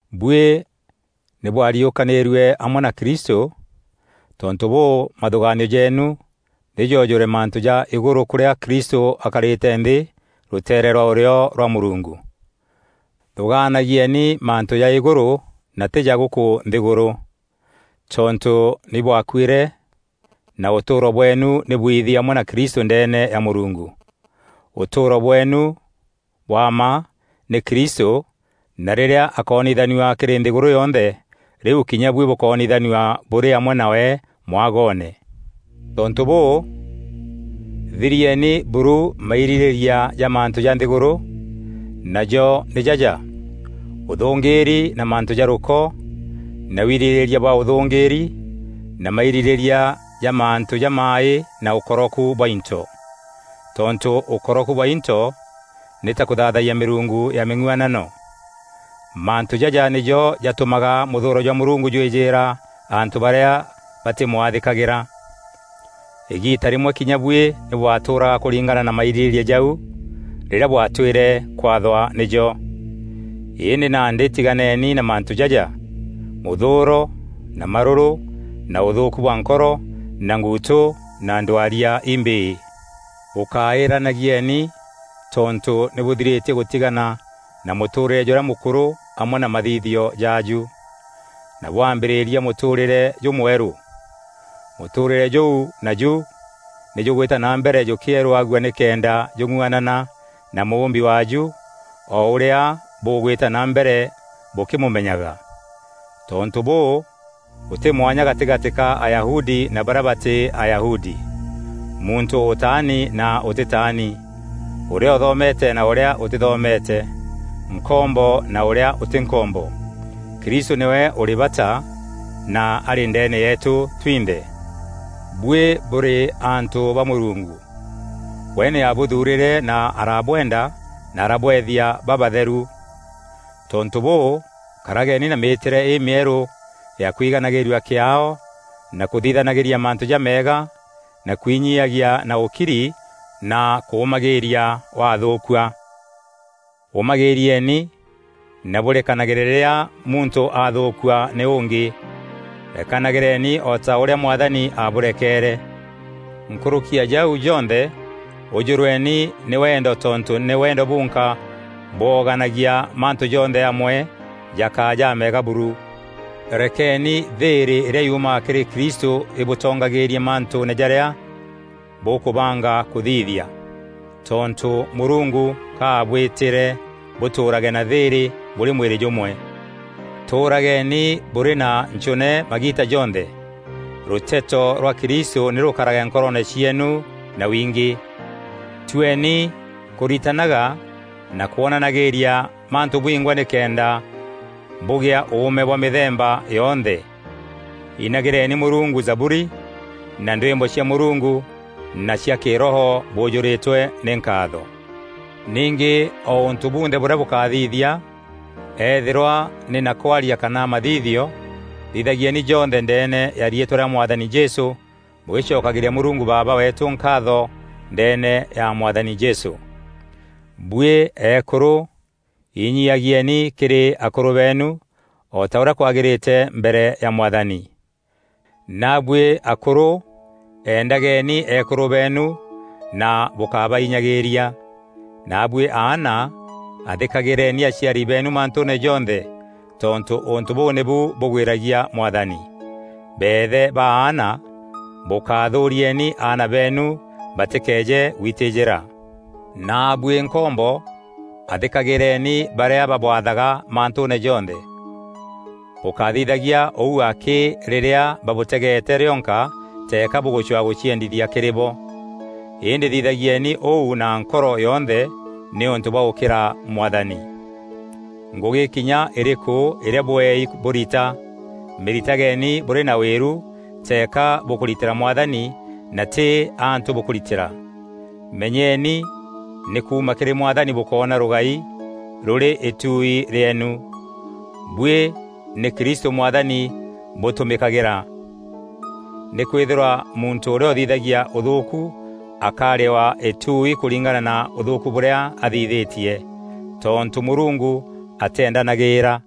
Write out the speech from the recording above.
Buî nî bwariûkanîîrue amwe na Kristû, tontû bûû, mathûgaanio jeenu nî joojûre mantû ja îgûrû kûrîa Kristû akarîte nthî rûteere rwa ûrîo rwa Mûrungu. Thûgaanagieni mantû ja îgûrû na tî ja gûkû nthîgûrû. Tontû nî bwakuîre na ûtûûro bweenu nî bwiithi amwe na Kristû ndeene ya Mûrungu. Ûtûûro bweenu bwa mma nî Kristû na rîrîa akoonithanua kîrî nthîgûrû yonthe, rîu kinya buî bûkoonithanua bûrî amwe nawe mwagoone. Tontû bûû, thirieni buru mairîrîîria ja mantû ja nthîgûrû, najo nî jaja: ûthûngîîri na mantû ja rûko na wirîrîria bwa ûthûngîîri na mairîrîîria ja mantû jamaaî na ûkoroku bwa into. Tontû ûkoroku bwa into nî ta kûthaathayia mîrungu ya mîng'uanano. Mantû jaja nîjo jatûmaga mûthûûro jwa Mûrungu jwîjîîra antû barîa batîmwathîkagîra. Îgiita rîmwe kinya buî nî bwatûûraga kûringana na mairîrîîria jau, rîrîa bwatwîre kwathwa nîjo. Îndî nandî tîganeeni na mantû jaja: mûthûûro na marûrû na ûthûûku bwa nkoro na nguutû na ndwaria imbîî. Bûkáîranagieni tontû nî bûthirîtie gûtigana na mûtûûrîre jûrîa mûkûrû amwe na mathithio jaaju, na bwambîrîria mûtûûrîre jûmwerû. Mûtûûrîre jûu naju nî jûgwîta na mbere jûkîerûagua nîkenda jûng'uanana na mûûmbi waaju o ûrîa bûgwîta na mbere bûkîmûmenyaga. Tontû bûû, gûtî mwanya gatîgatî ka Ayahudi na barîa batî Ayahudi; muntû ûtaani na ûtîtaani; ûrîa ûthomete na ûrîa ûtîthomete; nkombo na ûrîa ûtî nkombo. Kristû nîwe ûrî bata na arî ndeene yeetû twinthe. Buî bûrî antû ba Mûrungu. We nî aabûthuurîre na araabwenda na arabweethia babatheru. Tontû bûû, karageni na mîîtîre îmîerû ya kwiganagîîrua kîaao na kûthithanagîria mantû jameega na kwinyiagia na ûkiri na kûûmagîîria wathûûkua. Ûmagîîrieni na bûrekanagîre rîrîa muntû aathûûkua nî ûngî. Rekanagîreni o ta ûrîa Mwathani abûrekeere. Nkûrûki ya jau jonthe ûjûrweni nî wendo tontû nî wendo bunka bwooganagia mantû jonthe amwe jakaa jameega buru. Rekeni thîîrî îrîa yumaga kîrî Kristû îbûtongagîîrie mantûûne jarîa bûkûbanga kûthithia. Tontû Mûrungu ka aabwîtîre bûtûûrage na thîîrî bûrî mwîrî jûmwe. Tûûrageni bûrî na nchûne magiita jonthe. Rûteto rwa Kristû nî rûkarage nkoroone cieenu na wingî. Tueni kûritananaga na kwonanagîîria mantû bwingwa nîkenda bûgea ûûme bwa mîthemba yonthe. Înagîreni Mûrungu Zaburi na ndwîmbo cia Mûrungu na cia Kîroho bûûjûrîtwe nî nkaatho. Ningî o ûntû bunthe bûrîa bûkathithia, eethîrwa nî na kwaria kana mathithio, thithagieni jonthe ndeene ya riîtwa rîa Mwathani Jesû bûgîcokagîria Mûrungu Baaba weetû nkaatho ndeene ya Mwathani Jesû. Buî eekûrû, inyiiagieeni kîrî akûrû beenu, o ta ûrîa kwagîrîte mbere ya Mwathani. Naabuî akûrû, endageni eekûrû beenu na bûkábainyagîîria. Naabuî aana, athîkagîreeni aciari beenu mantûûne jonthe tontû ûntû bûu nîbu bûgwîragia Mwathani. Beethe ba aana, bûkathûûrieni aana beenu batîkeeje gwitîjîra. Naabuî nkombo, athîkagîreeni barîa babwathaga mantûûne jonthe. Bûkáthithagia ûu akî rîrîa babûtegeete rîonka teeka bûgûcwa gûciendithia kîrî bo; îndî thithagieni ûu na nkoro yonthe nîûntû bwa gûkîra Mwathani. Ngûgî kinya îrîkû îrîa bweei bûrita, mîritageni bûrî na wîru teeka bûkûritîra Mwathani na tî antû bûkûritîra. Menyeni nî kuuma kîrî Mwathani bûkoona rûgai rûrî îtuui rîeenu. Buî nî Kristû Mwathani bûtûmîkagîra. Nîkwîthîrwa muntû ûrîa ûthithagia ûthûûku akarîwa îtuui kûringana na ûthûûku bûrîa athithîtie, tontû Mûrungu atîendanagîîra.